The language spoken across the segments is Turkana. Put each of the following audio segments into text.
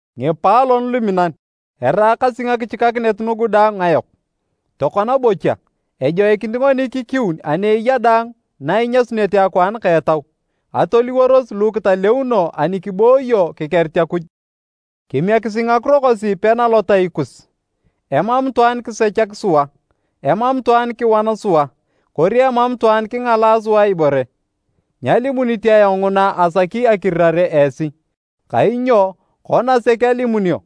Ngipaalon luminan, eraakasi ngakichikakinet nugu daang ngayok. Tokona bocha, ejoikinit ngoni kikiun ani eya daang na inyasunete akwaan ka etau. Atoliworos lu kitaleuno ani kibooyo kikerit Akuj. Kimiekisi ngakiro kosi pena lotai kus. Emam itwaan kisechak sua, emam itwaan kiwan sua, kori emam itwaan kingalaa sua ibore. Nyalimunit ayong nguna asaki akirirare esi, kainyo, kona sek alimunio,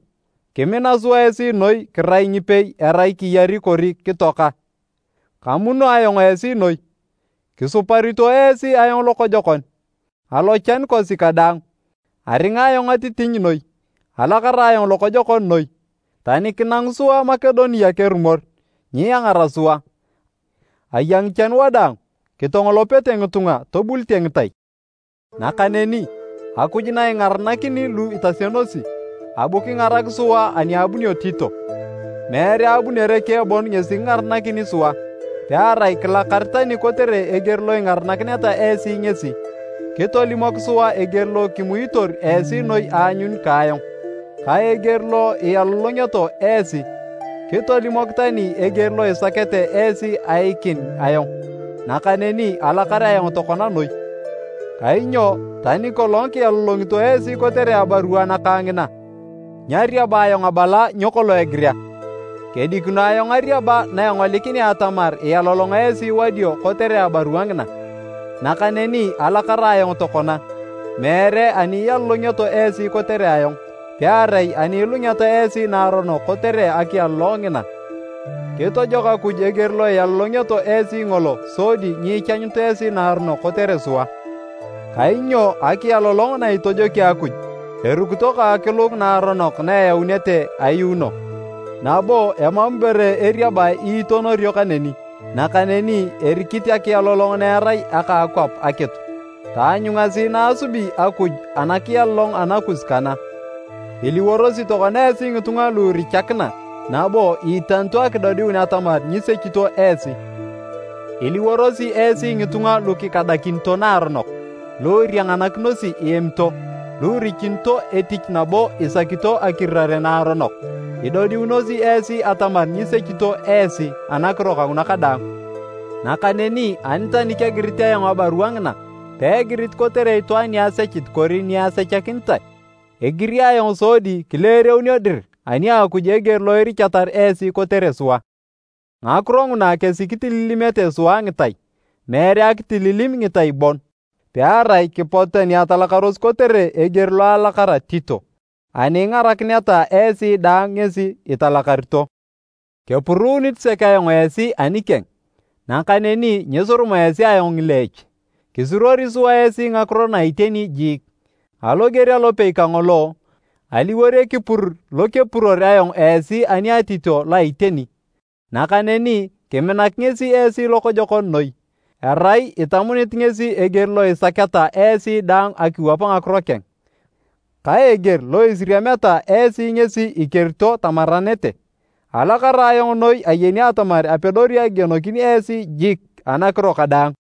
kimina sua esi noi kirai ngipei erai kiyari kori kitoaka. Kamuno ayong esi noi, kisuparito esi ayong lokojokon! Alochan kosi kadaang, aringa ayong atitiny noi, alakara ayong lokojokon noi. Tani kinangu sua Makedonia kerumor, nyiangara sua. Aya ngichan wadaang, kitongolopete ngitunga, tobulite ngitai. Nakaneni, Akuj na ingaranakini lu itasionosi, abu kingarak sua ani abunio Tito. Meere abunere keng bon ngesi kingarakini sua, pearai kilakar tani kotere eger lo ingarakineta esi ngesi. Kitolimok sua eger lo kimuitor esi noi aanyun ka ayong, ka eger lo ialolongeto esi. Kitolimok tani eger lo isaketa esi aiikin ayong, nakaneni alakar ayong tokona noi. Kainyo tani kolong kialolongito esi kotere abarua nakang ngina, nyariaba ayong abala nyo kolong egirea. Kedikino ayong ariaba na engolikinea atamar ialolong esi wadio kotere abarua ngina. Nakaneni alakara ayong tokona, meere ani ialolongioto esi kotere ayong, pearai ani ilungeta esi naaronok kotere akialolong ngina. Kitojok Akuj eger lo ialolongioto esi ngolo sodi nyiichanyut esi naaronok kotere sua. Kainyo akialolong na itojoki Akuj, erukito ka akilung naaronok na eyaunete ayuuno, nabo emam ibore eriabae iitonorio kaneni! Nakaneni erikit akialolong na erai aka akwap akitu. Taanyungasi na asubi Akuj anakialolong anakus kana: iliworosi tokona esi ngitunga lu irichakina nabo iitanito akidodiun atamar nyisechito esi! Iliworosi esi ngitunga lu kikadakinito naaronok, lu irianganakinosi iemito, lu irichunito etich nabo isakito akirirare naaronok! Idodiunosi esi atamar nyisechito esi anakiro kanguna kadaang. Nakaneni, ani tani kegirit ayong abarua ngina, peegirit kotere itwaan ni asechit kori ni asechakinitae. Egiri ayong sodi kileereunio dir ani a Akuj eger lo irichatar esi kotere sua. Ngakiro nguna kesi kitililimete sua ngitai. Meere akitililim ngitai bon, pearai kipotu tani atalakaros kotere eger lo alakara Tito, ani ingarakineta esi daang ngesi italakarito. Kepuruunit sek ayong esi anikeng, nakaneni nyisuruma esi ayong ngileech. Kisuruori sua esi ngakiro na iteni jiik, aloger alopei kangolo, aliwor ekipur lo kepuror ayong esi ani a Tito lo a iteni. Nakaneni kiminak ngesi esi lokojokon noi, erai itamunit ngesi eger lo isaketa esi daang akiwap ngakiro keng, ka eger lo isiriameta esi ngesi ikerito tamaranete. Alakara ayong noi ayeni atamar apedori akigienokin esi jik anakiro kadaang.